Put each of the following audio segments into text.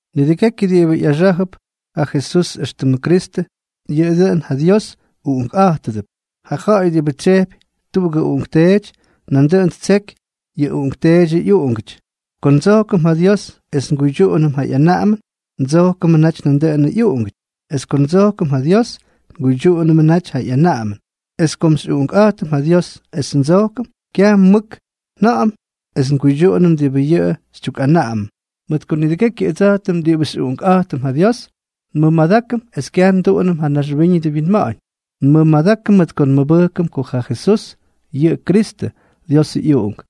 Nidʉgekyʉ diꞌibʉ ꞌyaxá̱jʉp ja Jesús éxtʉmʉ Kristʉ, yʉꞌʉ dʉꞌʉn ja Dios uꞌunkꞌa̱jtʉdʉp. Ja ja̱ꞌa̱y diꞌibʉ tsyejpy tuꞌugʉ uꞌunkteety, nandʉꞌʉn ttseky yʉ uꞌunkteedyʉ ꞌyuꞌungʉty. Ko ndsojkʉm ja Dios es nguydyuꞌunʉm ja ꞌyanaꞌamʉn, ndsojkʉmʉ naty nandʉꞌʉnʉ ꞌyuꞌungʉty. Es ko ndsojkʉm ja Dios, nguydyuꞌunʉmʉ naty yʉ ꞌyanaꞌamʉn. Es kom xyꞌuꞌunkꞌa̱jtʉm ja Dios es ndsojkʉm, kyaj mʉk nja̱ꞌa̱m es nguydyuꞌunʉm diꞌibʉ yʉꞌʉ xytyukꞌanaꞌamʉm, mʉt ko nidʉgekyʉ ʉdsa̱jtʉm diꞌibʉ xyꞌuꞌunkꞌa̱jtʉm ja Dios, nmʉmadákʉm es kyaj nduꞌunʉm ja naxwíñʉdʉ winma̱ꞌa̱ñ. Nmʉmadákʉm mʉt ko nmʉbʉjkʉm ko ja Jesús yʉꞌʉ Kristʉ, Diosʉ ꞌyUꞌunk.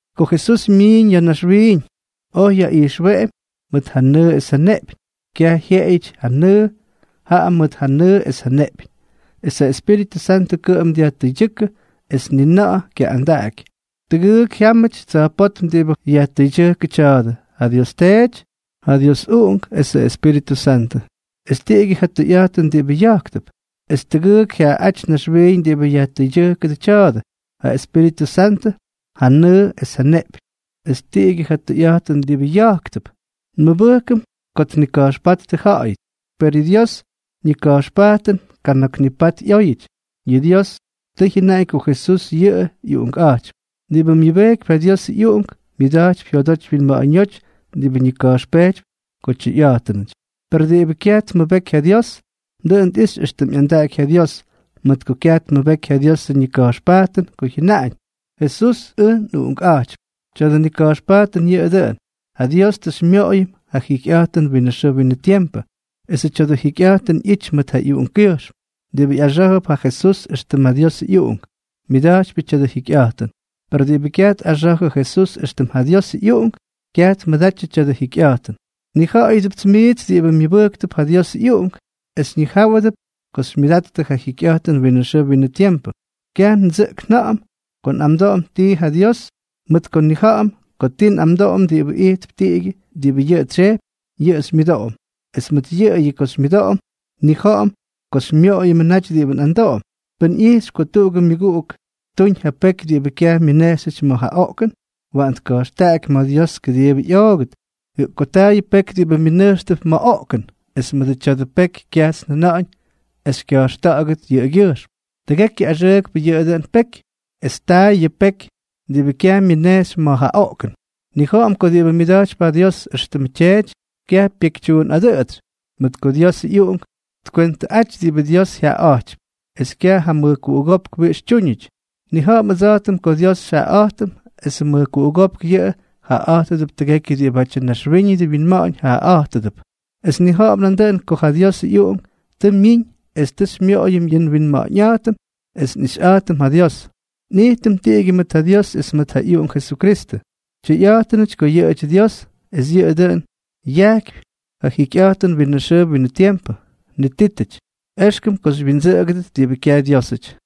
Ko Jesús myiiñ ya̱ naxwiiñ, oj yaꞌijxweꞌemy mʉt ja nʉʉ es ja neꞌpyñ, kyaj jyeꞌeyʉty ja nʉʉ, jaꞌa mʉt ja nʉʉ es ja neꞌpyñ. Es ja Espíritʉ Santʉ kʉꞌʉm dyajtʉydyʉ́kʉ, es ni na̱ꞌa̱ kyaꞌꞌandaꞌaky. Tʉgʉʉk jyamꞌaty tsa̱jpótm diꞌibʉ yajtʉydyʉjkʉbʉ tya̱a̱dʉ: ja Dios Teety, ja Diosʉ ꞌyUꞌunk esʉ Espíritʉ Santʉ. Es tiꞌigyʉ ja tʉyꞌa̱jtʉn diꞌibʉ ya̱jktʉp. Es tʉgʉʉk jyaaꞌáty naxwiiñ diꞌibʉ yajtʉydyʉjkʉdʉbʉ tya̱a̱dʉ: ja Espíritʉ Santʉ, ja nʉʉ es ja neꞌpyñ. Es tiꞌigyʉ ja tʉyꞌa̱jtʉn diꞌibʉ ya̱jktʉp. Nmʉbʉjkʉm ko tnika̱jxpáttʉ ja̱ꞌa̱yʉty. Per yʉ Diosʉ ñika̱jxpajtʉn kana̱k nipat ꞌyóyʉty. Yʉ Dios tʉ jyʉnaꞌañ ko Jesús yʉꞌʉ ꞌyUꞌunkꞌa̱jtypy. Diꞌibʉ myʉbejkypy ja Diosʉ ꞌyUꞌunk, myʉda̱jtypy jyodoty wyinma̱ꞌa̱ñóty diꞌibʉ ñika̱jxpejtypy ko tyʉyꞌa̱jtʉnʉty. Per diꞌibʉ kyaj tmʉbeky ja Dios, dʉꞌʉn tꞌixy éxtʉm ꞌyandaꞌaky ja Dios, mʉt ko kyaj tmʉbeky ja Diosʉ ñika̱jxpajtʉn ko jyajʉnáñ: “Jesús ʉj nꞌUꞌunkꞌa̱jtypy.” Tya̱dʉ nika̱jxpajtʉn yʉꞌʉ dʉꞌʉn: ja Dios tʉ xymyoꞌoyʉm ja jikyꞌa̱jtʉn winʉ xʉʉ winʉ tiempʉ, esʉ tya̱dʉ jikyꞌa̱jtʉn ꞌyity mʉt ja ꞌyUꞌunkkyʉjxm. Diꞌibʉ ꞌyaxá̱jʉp ja Jesús éxtʉm ja Diosʉ ꞌyUꞌunk, myʉda̱jtypyʉ tya̱dʉ jikyꞌa̱jtʉn. Per diꞌibʉ kyaj tꞌaxa̱jʉ Jesús éxtʉm ja Diosʉ ꞌyUꞌunk, kyaj tmʉdatyʉ tya̱dʉ jikyꞌa̱jtʉn. Nnija̱ꞌa̱yʉdʉpts miits diꞌibʉ myʉbʉjktʉp ja Diosʉ ꞌyUꞌunk, es xyñijáwʉdʉt ko xymyʉdattʉ ja jikyꞌa̱jtʉn winʉ xʉʉ winʉ tiempʉ. Kyaj ndsʉꞌk nja̱ꞌa̱m ko nꞌamdoꞌom tii ja Dios, mʉt ko nnija̱ꞌa̱m ko ti nꞌamdoꞌom diꞌibʉ ijtp tiꞌigyʉ diꞌibʉ yʉꞌʉ tsyejpy, yʉꞌʉ xymyʉdoꞌom. Es mʉt yʉꞌʉyʉ ko xymyʉdoꞌom, nnija̱ꞌa̱m ko xymyoꞌoyʉmʉ naty diꞌibʉ nꞌamdoꞌom. Pʉn ꞌyijxypy ko tuꞌugʉ myʉguꞌuk ttuñ ja peky diꞌibʉ kyaj myʉnejxyʉty ma̱ ja oꞌkʉn, waꞌan tka̱jxtaꞌaky ma̱ Dios kʉdiibʉ ꞌyoogʉt. Jaꞌa ko taa yʉ peky diꞌibʉ mʉnʉjxp ma̱ ja oꞌkʉn, es mʉdʉ tya̱dʉ peky kyajts njʉna̱ꞌa̱ñ es kya̱jxta̱ꞌa̱gʉt yʉꞌʉgyʉjxm. Tʉgekyʉ axʉʉkpʉ yʉꞌʉ dʉn peky. Es taa yʉ peky diꞌibʉ kyaj myʉnejxy ma̱ ja oꞌkʉn. Nnija̱ꞌa̱m ko diꞌibʉ myʉda̱jtypy ja Dios éxtʉmʉ Tyeety, kyaj pyekytyuunꞌadʉꞌʉtsy, mʉt ko Diosʉ ꞌyUꞌunk tkwentʉꞌaty diꞌibʉ Dios jyaꞌaꞌa̱jtypy, es kyaj ja mʉjkuꞌugópk wiꞌix tyúñʉty. Nnija̱ꞌa̱m ʉdsa̱jtʉm ko Dios xyjaꞌaꞌa̱jtʉm esʉ mʉjkuꞌugópk yʉꞌʉ jaꞌaꞌa̱jtʉdʉp tʉgekyʉ diꞌibátyʉ naxwíñʉdʉ winma̱ꞌa̱ñ jaꞌaꞌa̱jtʉdʉp. Es nnija̱ꞌa̱m nandʉꞌʉn ko ja Diosʉ ꞌyUꞌunk tʉ myiñ es tʉ xymyoꞌoyʉm yʉ nwinma̱ꞌa̱ñꞌa̱jtʉm es nꞌixyꞌa̱jtʉm ja Dios. Nꞌijtʉm tiꞌigyʉ mʉt ja Dios es mʉt ja ꞌyUꞌunk Jesukristʉ. Tyʉyꞌa̱jtʉnʉty ko yʉꞌʉdyʉ Dios, es yʉꞌʉ dʉꞌʉn yajkypy ja jikyꞌa̱jtʉn winʉ xʉʉ winʉ tiempʉ. Nitítʉty, éxkʉm ko xywyindsʉꞌʉgʉdʉt diꞌibʉ kyaj Dyiosꞌaty.